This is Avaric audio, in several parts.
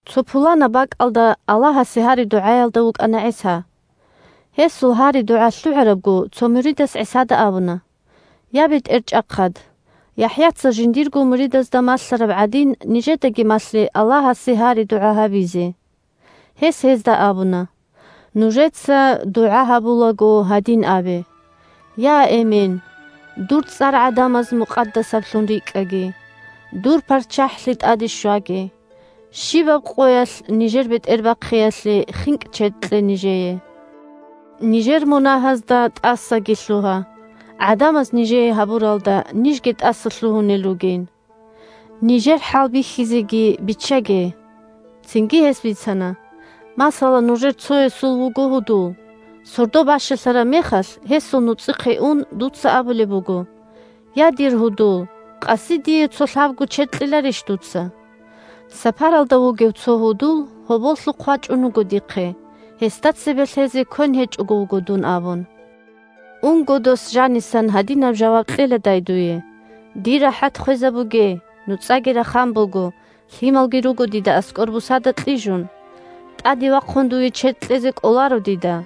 Цо пуланаб бакӀалда Аллагьасе гьари-дугӀаялда вукӀана ГӀиса. Гьесул гьари-дугӀа лъугӀарабго, цо муридас ГӀисада абуна: – Я, БетӀерчӀахъад! ЯхӀяца жиндирго муридазда малъараб гӀадин, нижедаги малъе Аллагьасе гьари-дугӀа гьабизе. Гьес гьезда абуна: – Нужеца дугӀа гьабулаго гьадин абе: Я, Эмен, дур цӀар гӀадамаз мукъадасаблъун рикӀкӀаги, дур ПарччахӀлъи тӀаде щваги, щибаб къоялъ нижер бетӀербахъиялъе хинкӀ-чед кье нижее, нижер мунагьазда тӀасаги лъугьа, гӀадамаз нижее гьабуралда нижги тӀасалъугьунел ругин. Нижер хӀалбихьизеги биччаге. Цинги гьес бицана: – Масала, нужер цоясул вуго гьудул, сордо бащалъараб мехалъ гьесул нуцӀихъе ун дуца абулеб буго: «Я, дир гьудул, къаси дие цо лъабго чед кьеларищ дуца? Сапаралда вугев цо гьудул гьоболлъухъ вачӀун вуго дихъе, гьесда цебе лъезе квен гьечӀого вуго дун», – абун. Унго, дос жанисан гьадинаб жаваб кьеладай дуе: «Дир рахӀат хвезабуге. НуцӀаги рахан буго, лъималги руго дида аскӀор бусада кьижун. ТӀаде вахъун дуе чед кьезе кӀоларо дида».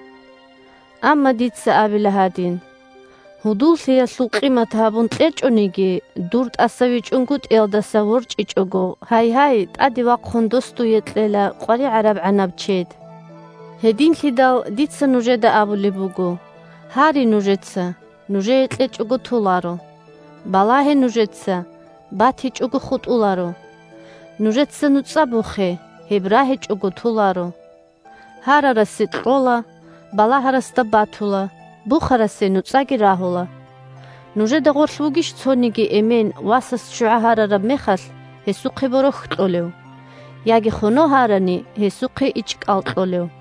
Амма дица абила гьадин: гьудуллъиялъул къимат гьабун кьечӀониги, дур тӀасавичӀунгутӀиялдаса ворчӀичӀого, гьайгьай, тӀаде вахъун дос дуе кьела къваригӀарабгӀанаб чед. Гьединлъидал дица нужеда абулеб буго: гьаре нужеца – нужее кьечӀого толаро; балагье нужеца – батичӀого хутӀуларо; нужеца нуцӀа бухе – гьеб рагьичӀого толаро. Гьарарасе кьола, балагьарасда батула, бухарасе нуцӀаги рагьула. Нужеда гъорлъ вугищ цониги эмен, васас ччугӀа гьарараб мехалъ, гьесухъе борохь кьолев? Яги, хоно гьарани, гьесухъе ичӀкӀал кьолев?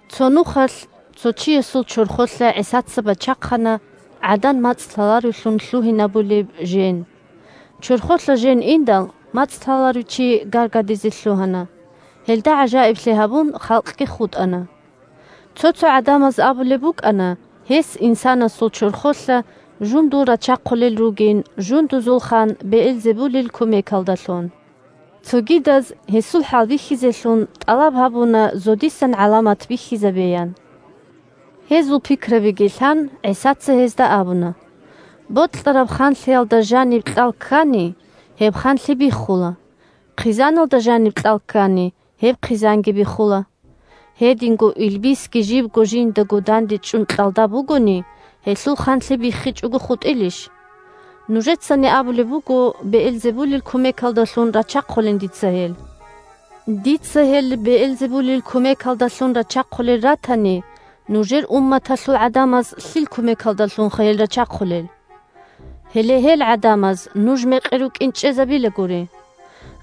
Цо нухалъ цо чиясул чорхолъа ГӀисаца бачахъана гӀадан мацӀ лъаларевлъун лъугьинавулеб жен. Чорхолъа жен индал, мацӀ лъаларев чи гаргадизе лъугьана, гьелда гӀажаиблъи гьабун халкъги хутӀана. Цо-цо гӀадамаз абулеб букӀана гьес инсанасул чорхолъа жундул рачахъулел ругин жундузул хан Беэлзебулил кумекалдалъун. Цогидаз, гьесул хӀалбихьизелъун, тӀалаб гьабуна зодисан гӀаламат бихьизабеян. Гьезул пикрабиги лъан, ГӀисаца гьезда абуна: – Бокьараб ханлъиялда жаниб кьал ккани – гьеб ханлъи биххула, хъизаналда жаниб кьал ккани – гьеб хъизанги биххула. Гьединго илбисги жибго жиндаго дандечӀун кьалда бугони, гьелъул ханлъи биххичӀого хутӀилищ? Нужецани абулеб буго Беэлзебулил кумекалдалъун рачахъулин дица гьел. Дица гьел Беэлзебулил кумекалдалъун рачахъулел ратани, нужер умматалъул гӀадамаз лъил кумекалдалъунха гьел рачахъулел? Гьеле гьел гӀадамаз нуж мекъи рукӀин чӀезабила гури.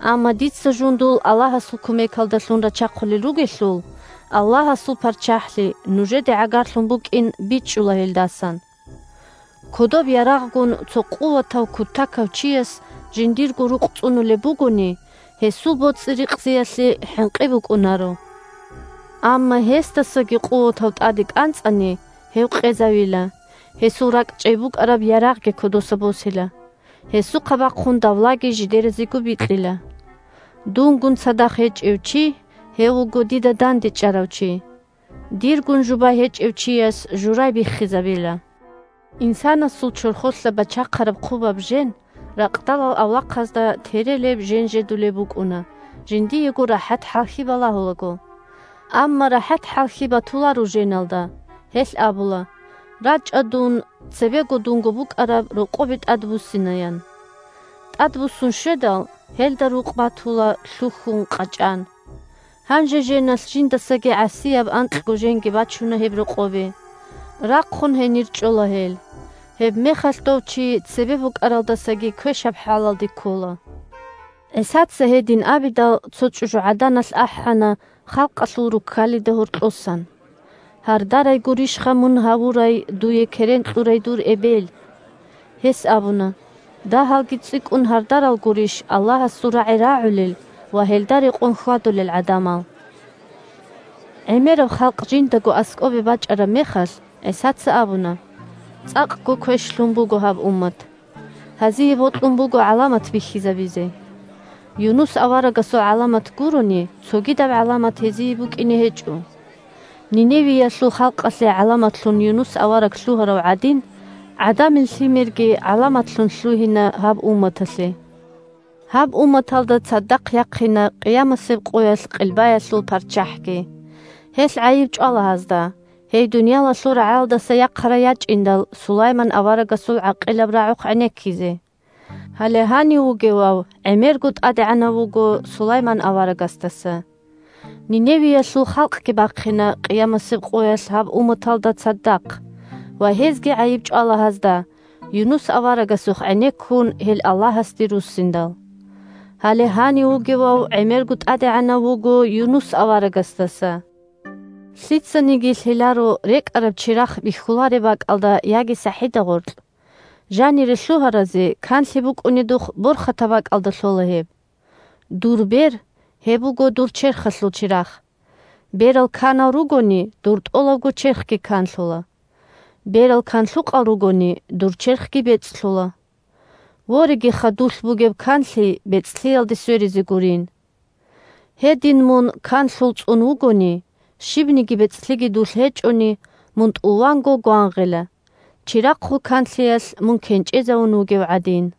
Амма дица жундул Аллагьасул кумекалдалъун рачахъулел ругелъул, Аллагьасул ПарччахӀлъи нужеде гӀагарлъун букӀин бичӀчӀула гьелдасан. Кодоб ярагъгун цо къуватав-кутакав чияс жиндирго рукъ цӀунулеб бугони, гьесул боцӀи-рикъзиялъе хӀинкъи букӀунаро. Амма гьесдасаги къуватав тӀаде кӀанцӀани, гьев къезавила, гьесул ракӀчӀей букӀараб ярагъги кодоса босила, гьесухъа бахъун давлаги жидеразего бикьила. Дунгун цадахъ гьечӀев чи – гьев вуго дида дандечӀарав чи. Диргун жубай гьечӀев чияс журай биххизабила. Инсанасул чорхолъа бачахъараб хъубаб жен ракъдалал авлахъазда терелеб-женжедулеб букӀуна, жиндиего рахӀат-хӀалхьи балагьулаго. Амма рахӀат-хӀалхьи батуларо женалда. Гьелъ абула: «РачӀа, дун цебе дунго букӀараб рокъобе тӀадбуссина», – ян. ТӀадбуссун щведал, гьелда рукъ батула лъухьун, къачӀан. Гьанже женалъ жиндасаги гӀасияб анкьго женги бачуна гьеб рокъобе. Рахъун гьенир чӀола гьел. Гьебмехалъ дов чи цебе букӀаралдасаги квешаб хӀалалде ккола. ГӀисаца гьедин абидал, цо чӀужугӀаданалъ ахӀана халкъалъул руккалида гьоркьосан: – Гьардарай гурищха мун гьавурай, дуе керен кьурай дур эбел! Гьес абуна: – Дагьалги цӀикӀкӀун гьардарал гурищ Аллагьасул рагӀи рагӀулел ва гьелда рекъон хьвадулел гӀадамал! ГӀемераб халкъ жиндаго аскӀобе бачӀараб мехалъ, ГӀисаца абуна: – ЦӀакъго квешлъун буго гьаб уммат! Гьазие бокьун буго гӀаламат бихьизабизе. Юнус аварагасул гӀаламат гурони, цогидаб гӀаламат гьезие букӀине гьечӀо. Ниневиялъул халкъалъе гӀаламатлъун Юнус авараг лъугьарав гӀадин, ГӀадамил Лъимерги гӀаламатлъун лъугьина гьаб умматалъе. Гьаб умматалда цадахъ яхъина къиямасеб къоялъ Къилбаялъул парччахӀги. Гьелъ гӀайиб чӀвала гьазда, гьей дуниялалъул рагӀалдаса яхъарай ячӀиндал Сулайман аварагасул гӀакъилаб рагӀухъ гӀенеккизе. Гьале гьанив вугевав гӀемерго тӀадегӀанав вуго Сулайман аварагасдаса. Ниневиялъул халкъги бахъина къиямасеб къоялъ гьаб умматалда цадахъ ва гьезги гӀайиб чӀвала гьазда, Юнус аварагасухъ гӀенеккун гьел Аллагьасде руссиндал. Гьале гьанив вугевав гӀемерго тӀадегӀанав вуго Юнус аварагасдаса. Лъицаниги лъеларо рекӀараб чирахъ бихьулареб бакӀалда яги сахӀида гъоркь. Жанире лъугьаразе канлъи букӀунедухъ борхатаб бакӀалда лъола гьеб. Дур бер – гьеб буго дур черхалъул чирахъ. Берал канал ругони, дур тӀолабго черхги канлъула. Берал канлъукъал ругони, дур черхги бецӀлъула. Ворегиха, дулъ бугеб канлъи бецӀлъиялде сверизе гурин. Гьедин, мун канлъул цӀун вугони, щибниги бецӀлъиги дулъ гьечӀони, мун тӀуванго гвангъила, чирахъул канлъиялъ мун кенчӀезавун вугев гӀадин.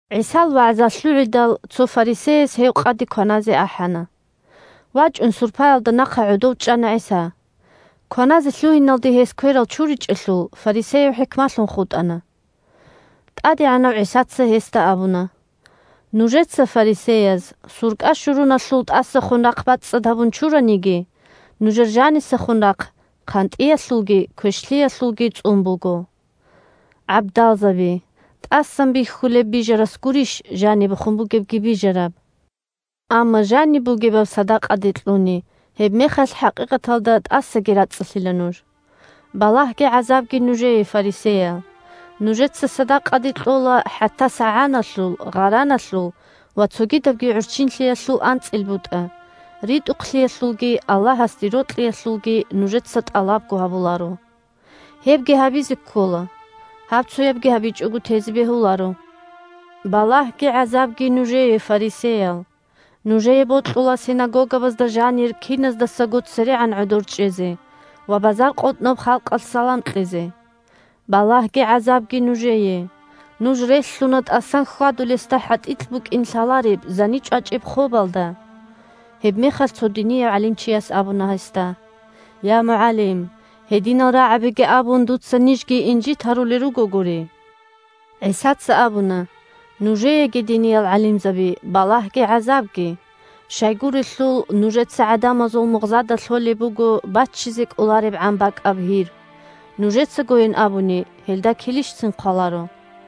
ГӀисал вагӀза лъугӀидал, цо фарисеяс гьев къаде кваназе ахӀана. ВачӀун сурпаялда нахъа гӀодов чӀана ГӀиса. Кваназе лъугьиналде гьес кверал чуричӀелъул, фарисеяв хӀикмалъун хутӀана. ТӀадегӀанав ГӀисаца гьесда абуна: – Нужеца, фарисеяз, суркӀа-щуруналъул тӀасахун рахъ бацӀцӀад гьабун чураниги, нужер жанисахун рахъ хъантӀиялъулги квешлъиялъулги цӀун буго. ГӀабдалзаби! ТӀасан бихьулеб бижарас гурищ жанибехун бугебги бижараб? Амма жаниб бугебаб садакъаде кьуни, гьебмехалъ хӀакъикъаталда тӀасаги рацӀцӀалъила нуж. Балагьги гӀазабги нужее, фарисеял. Нужеца садакъаде кьола хӀатта сагӀаналъул, гъараналъул ва цогидабги гӀурччинлъиялъул анцӀил бутӀа АнцӀил бутӀа – закагӀат., ритӀухълъиялъулги Аллагьасде рокьиялъулги нужеца тӀалабго гьабуларо. Гьебги гьабизе ккола, гьабцоябги гьабичӀого тезе бегьуларо. Балагьги гӀазабги нужее, фарисеял! Нужее бокьула синагогабазда жанир киназдасаго церегӀан гӀодор чӀезе ва базаркъотӀноб халкъалъ салам кьезе. Балагьги гӀазабги нужее! Нуж релълъуна тӀасан хьвадулесда хӀатӀикь букӀин лъалареб, зани чӀвачӀеб хобалда. Гьебмехалъ цо динияв гӀалимчияс абуна гьесда: – Я, МугӀалим! Гьединал рагӀабиги абун, дуца нижги инжит гьарулел ругогури. ГӀисаца абуна: – Нужееги, диниял гӀалимзаби, балагьги гӀазабги! Щайгурелъул нужеца гӀадамазул мугъзада лъолеб буго баччизе кӀоларебгӀан бакӀаб гьир, нужецагойин абуни, гьелда килищцин хъваларо.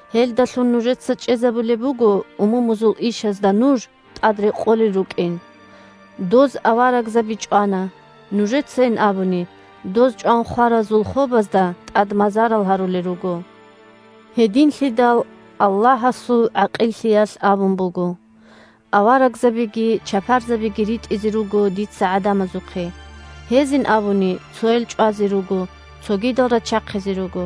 Гьелдалъун нужеца чӀезабулеб буго умумузул ишазда нуж тӀад рекъолел рукӀин. Доз аварагзаби чӀвана, нужецайин абуни, доз чӀван хваразул хобазда тӀад мазарал гьарулел руго. Гьединлъидал Аллагьасул ГӀакъиллъиялъ абун буго: «Аварагзабиги чапарзабиги ритӀизе руго дица гӀадамазухъе, гьезин абуни цоял чӀвазе руго, цогидал рачахъизе руго.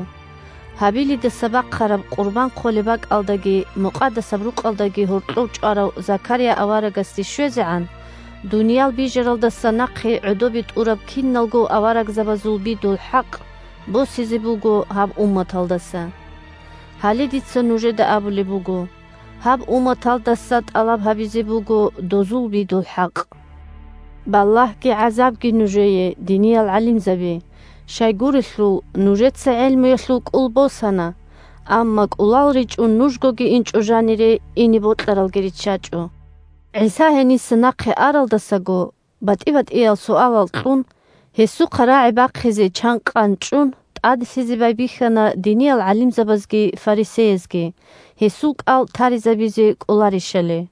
Гьабилидаса бахъараб къурбан хъолеб бакӀалдаги Мукъадасаб Рукъалдаги гьоркьов чӀварав Закария аварагасде щвезегӀан, дуниял бижаралдаса нахъе гӀодобе тӀураб киналго аварагзабазул бидул хӀакъ босизе буго гьаб умматалдаса». Гьале дица нужеда абулеб буго: гьаб умматалдаса тӀалаб гьабизе буго дозул бидул хӀакъ. Балагьги гӀазабги нужее, диниял гӀалимзаби! Щайгурелъул нужеца гӀелмуялъул кӀул босана, амма кӀулал ричӀун нужгоги инчӀо жанире, ине бокьаралги риччачӀо. ГӀиса гьениса нахъе аралдасаго, батӀи-батӀиял суалал кьун, гьесухъа рагӀи бахъизе чанкъан чӀун, тӀаделъизе байбихьана диниял гӀалимзабазги фарисеязги, гьесул кӀал таризабизе кӀоларищали.